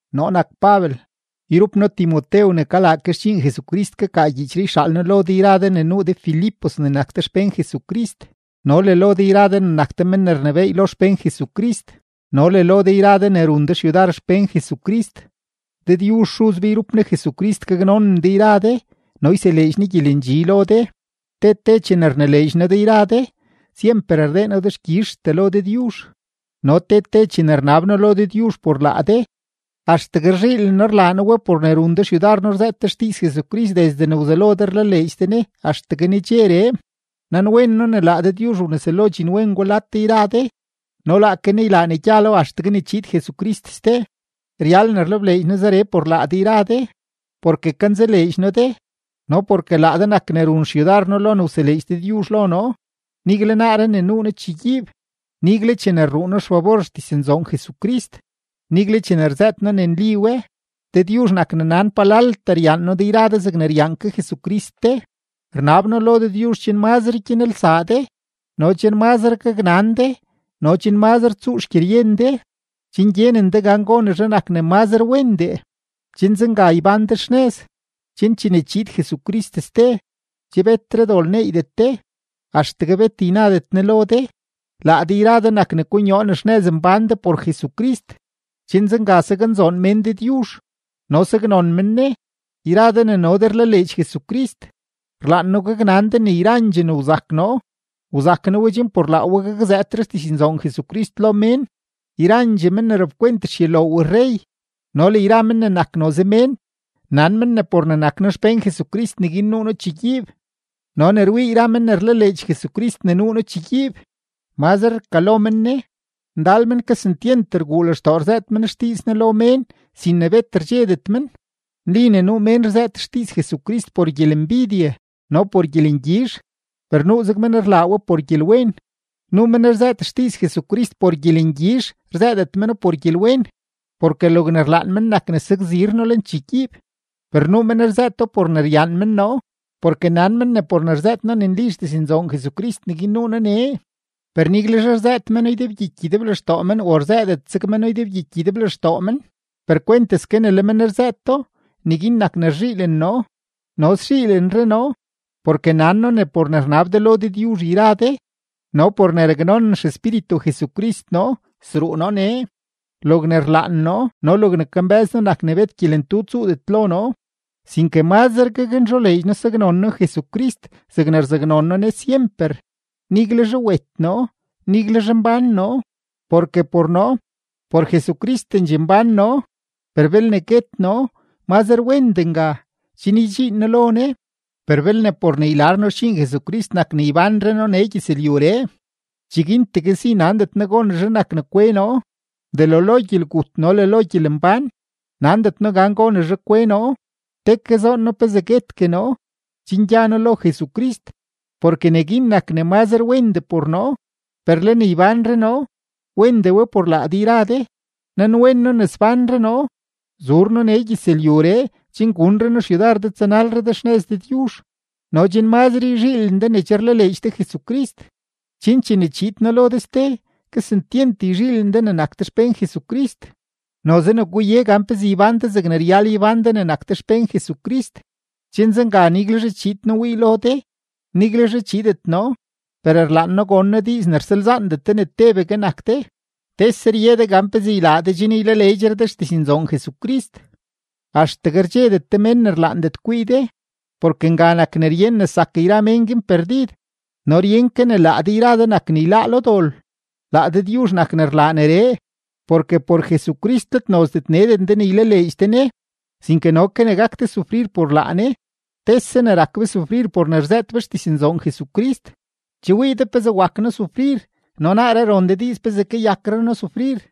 Noo nak Pabel, yrup noo Timotew ne kalaa ke xdxiin Jesucrist kakaa gyiichree yxaal noo lo de yra de ne nuu de Filipos ne nak de xpén Jesucrist no le lo de yra de ne nak de men ne rnebééy lo xpén Jesucrist no le lo de yra de ne run de xyudar xpén Jesucrist. Dëdyuzh Xuz be yrup Ne Jesucrist gaknonen de yra de no yseleedx Ne gyelendxi lo de. Te te chene rnileedx noo de yra de, syemper rdee noo dexkyizhtee lo Dëdyuzh. No te te chene rnab noo lo Dëdyuzh por laa de, axtegue rzhiilen noo rlaa noo we por ne run de xyudar noo rzëët de xdiiz Jesucrist desde ne wzelo de rlaleedx de Ne axtegue nedxeree. Nanwen noo ne laa Dëdyuzh wneselo dxinwen gwa lad de yra de no laake Ne ylaa ne gyalo axtegue ne chiid Jesucrist ste. Ryal ne rlebleedx noo zeree por laa de yra de, porke kanzaleedx noo de no porke laa de nak ne run xyudar noo lo ne wseleedx Dëdyuzh lo noo, nigle naaree ne nuu noo chegyiib, nigle chene rruu noo xfabor xdiznzoon Jesucrist, nigle chene rzëët noo ne nli we. Dëdyuzh nak ne nan palaltee ryaan noo de yra de zegne ryaan ke Jesucrist de. Rnab noo lo Dëdyuzh chen mazre gyanelsaa de no chen mazre gaknan de no chen mazre tsuu xgyeryen de, chen gyenen de gan gonezhe nak ne mazre wendee, chen zenga ybán de xnëz, chen chene chiid Jesucrist ste, che betre dol neeydet de, axtegue bet ynadet Ne lo de. Laa de yra de nak ne konyoo ne xnëz mbán de por Jesucrist, chen zenga saknzoon mén Dëdyuzh no saknon men Ne. Yra de ne no de rlaleedx Jesucrist, rlaan noo gaknan de ne yrandxee ne wzak noo, wzak noo we chen por laa we gakzëëtre xdiznzoon Jesucrist lo mén. Yrandxee men ne rapkwent xyuloow rrey no le yra men ne nak noze mén, nan men ne por ne nak noo xpén Jesucrist neguin nuu noo chegyiib. No ne rwii yra men ne rlaleedx Jesucrist ne nuu noo chegyiib, mazre rkalo men Ne; ndal men kesentyent rguu lextoo rzëët men xdiiz Ne lo mén sin ne bet rdxedet men. Nli ne nuu mén rzëët xdiiz Jesucrist por gyelembidye no le por gyelengyizh, per nuuzeg men rlaa we por gyelwen. Nuu men rzëët xdiiz Jesucrist por gyelengyizh, rzëëdet meno por gyelwen, porke logne rlaan men nak ne sakzir noo lenchegyiib. Per nuu men rzëëto por ne ryaan men noo, porke nan men ne por ne rzëët noo ne nli xdiznzoon Jesucrist neguin nuu noo nee. Per niguelzhe rzëët meno ydebgyiky ydeblextoo men o rzëëdet zeg meno ydebgyiky ydeblextoo men, per kwenteske ne le men rzëëto, neguin nak ne rzhiilen noo. No szhiilenre noo, porke nan noo ne por ne rnab de lo Dëdyuzh yra de no por ne raknonen XEspíritu Jesucrist noo, sruu noo nee. Logne rlaan noo no logne kambë́z noo nak ne bet gyelentu tsuudet lo noo, sinke mazre gaknzholeedx noo saknon noo Jesucrist zegne rzaknon noo Ne syemper, niguelzhe wet noo, niguelzhe mbán noo. Porke por noo, por Jesucristendxee mbán noo; per belne guet noo, mazre wendee nga, chen ydxiin noo lo Ne. Per belne por ne ylar noo xdxiin Jesucrist nak ne ybánre noo nee gyëzlyuree, cheguintegue si nandet noo gonezhe nak ne kwe noo. Delo lo gyelgut no le lo gyelembán, nandet noo gan gonezhe kwe noo; te ke zoon noo pezee guetgue noo, chen gya noo lo Jesucrist, porke neguin nak ne mazre wendee por noo. Per le ne ybánre noo, wendee we por laa de yra de. Nanwen noo ne sbánre noo, zuur noo nee gyëzlyuree chen gunre noo xyudar de tsanalre de xnëz Dëdyuzh no chen mazre yzhiilen de ne che rlaleedx de Jesucrist, chen chene chiid noo lo de ste, kesentyent yzhiilen de ne nak de xpén Jesucrist. Noze ne guye gan pezee ybán de zegne ryal ybán de ne nak de xpén Jesucrist, chen zenga niguelzhe chiid noo wii lo de, niguelzhe chiidet noo, per rlaan noo gon noo diiz ne rsalzaandet de ne tebegue nak de, tese rye de gan pezee ylaa de chen ylaleedxre de xdiznzoon Jesucrist, axtegue rdxedet de mén ne rlaandet kwii de; porke nga nak ne ryen ne zak yra mén guin perdid no ryen ke ne laa de yra de nak ne yláá lo dol. Laa Dëdyuzh nak ne rlaa neree. Porke por Jesucrist let nozdet neden de ne ylaleedx de Ne, sinke no ke ne gak de sufrir por laa Ne. Tese ne rak be sufrir por ne rzëët be xdiznzoon Jesucrist; che wii de pezee wak noo sufrir no naaree ron de diiz pezee kayakre noo sufrir.